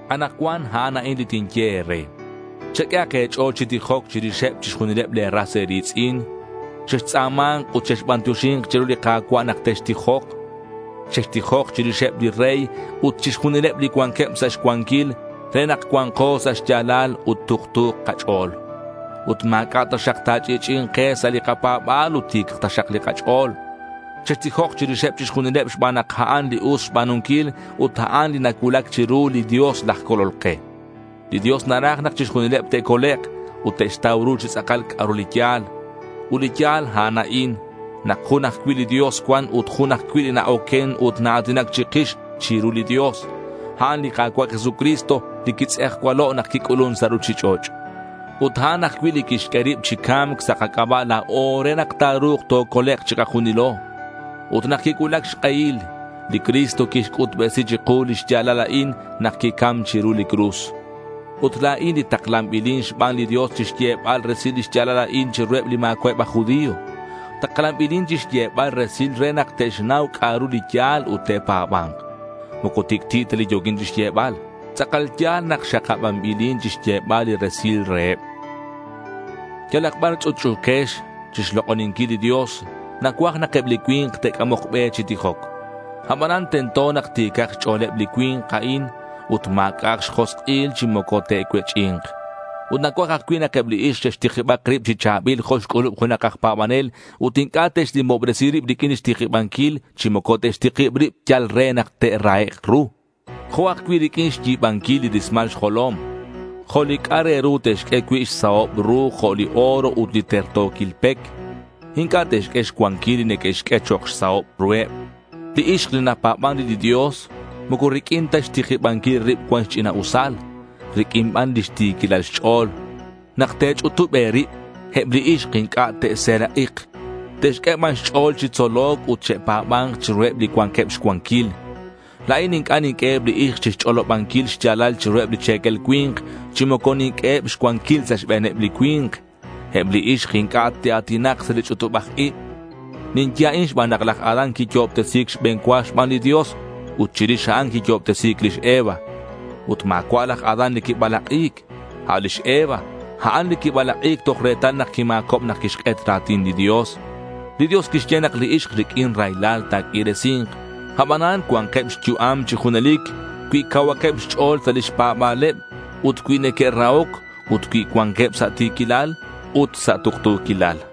Anakcuan a'an a'in li tinye e̱re: cheq'uehak e̱ch'o̱l chi tijoc chirixeb chixjunileb le̱ ras e̱ri̱tz'in. Chextz'a̱ma̱nk ut chexbantioxi̱nk chiru li Ka̱cua' nak textijok. Chextijok chirixeb li rey ut chixjunileb li cuanqueb sa' xcuanquil re nak cua̱nko sa' xya̱lal ut tuktu̱k kach'o̱l. Ut ma̱c'a' taxak ta̱ch'i'ch'i'i̱nk ke sa' li kapa̱ba̱l ut ti̱cak taxak li kach'o̱l. Chextijok chirixeb chixjunileb xban nak a'an li us xba̱nunquil ut a'an li nacuulac chiru li Dios laj Colol ke. Li Dios naraj nak chixjunileb te'colek' ut te'xtau ru chi tz'akal c'a'ru li ya̱l. Ut li ya̱l, a'an a'in: nak jun ajcui' li Dios cuan ut jun ajcui' li na-oquen ut naa̱tinac chikix chiru li Dios. A'an li Ka̱cua' Jesucristo li quitz'ejcualo' nak quic'ulun sa' ruchich'och'. Ut a'an ajcui' li quixq'ue rib chi ca̱mc sa' kac'aba' la̱o re nak ta̱ru̱k tocolek' chikajunilo. Ut nak quicuulac xk'ehil, li Cristo quixc'utbesi chiku li xya̱lal a'in nak quicam chiru li cruz. Ut la̱in li taklanbilin xban li Dios chixyebal resil li xya̱lal a'in chiruheb li ma̱cua'eb aj judío. Taklanbilin chixyebal resil re nak te'xnau c'a'ru li ya̱l ut te'pa̱ba̱nk. Moco tic'ti' ta li yo̱quin chixyebal. Tz'akal ya̱l nak xakabanbilin chixyebal li resilal reheb. Yalak bar ch'utch'u̱quex chixlok'oninquil li Dios, nacuaj nak eb li cui̱nk te'c'amok be chi tijoc. Abanan, tento nak ti̱cak xch'o̱leb li cui̱nk a'in ut ma̱c'a'ak xjosk'il chi moco te'cuech'i̱nk. Ut nacuaj ajcui' nak eb li ixk che'xtikibak rib chi cha̱bil jo' xc'ulub junak aj pa̱banel ut inc'a' te'xnimobresi rib riq'uin lix tikibanquil chi moco te'xtikib rib yal re nak te'rahek' ru. Jo' ajcui' riq'uin xyi̱banquil li rismal xjolom. Jo' li c'a' re ru te'xq'ue cui' xsahob ru jo' li oro ut li terto̱quil pec. Inc'a' te'xq'ue xcuanquil li neque'xq'ue chok' xsahob ruheb. Li ixk li napa̱ban re li Dios, moco riq'uin ta xtikibanquil rib cuan xch'ina'usal. Riq'uin ban lix ti̱quilal xch'o̱l. Nak te̱ch'utub e̱rib, eb li ixk inc'a' te'serak'ik. Te'xq'ue ban xch'o̱l chi tzoloc ut che'pa̱ba̱nk chiruheb li cuanqueb xcuanquil. La̱in inc'a' ninq'ueheb li ixk chixch'olobanquil xya̱lal chiruheb li che̱quel cui̱nk, chi moco ninq'ueheb xcuanquil sa' xbe̱neb li cui̱nk. Eb li ixk inc'a' te'a̱tinak sa' li ch'utubaj ib. Ninye a'in xban nak laj Adán quiyo'obtesi̱c xbe̱n cua xban li Dios ut chirix a'an quiyo'obtesi̱c lix Eva. Ut ma̱cua' laj Adán li quibalak'i̱c. A' lix Eva, a'an li quibalak'i̱c toj retal nak quima̱cob nak quixk'et ra̱tin li Dios. Li Dios quixye nak li ixk riq'uin raylal ta̱q'uiresi̱nk. Abanan, cua̱nkeb xyu'am chi junelic cui cauhakeb xch'o̱l sa' lix pa̱ba̱leb ut cui neque'rahoc ut cui cuanqueb sa' ti̱quilal ut sa' tuktu̱quilal.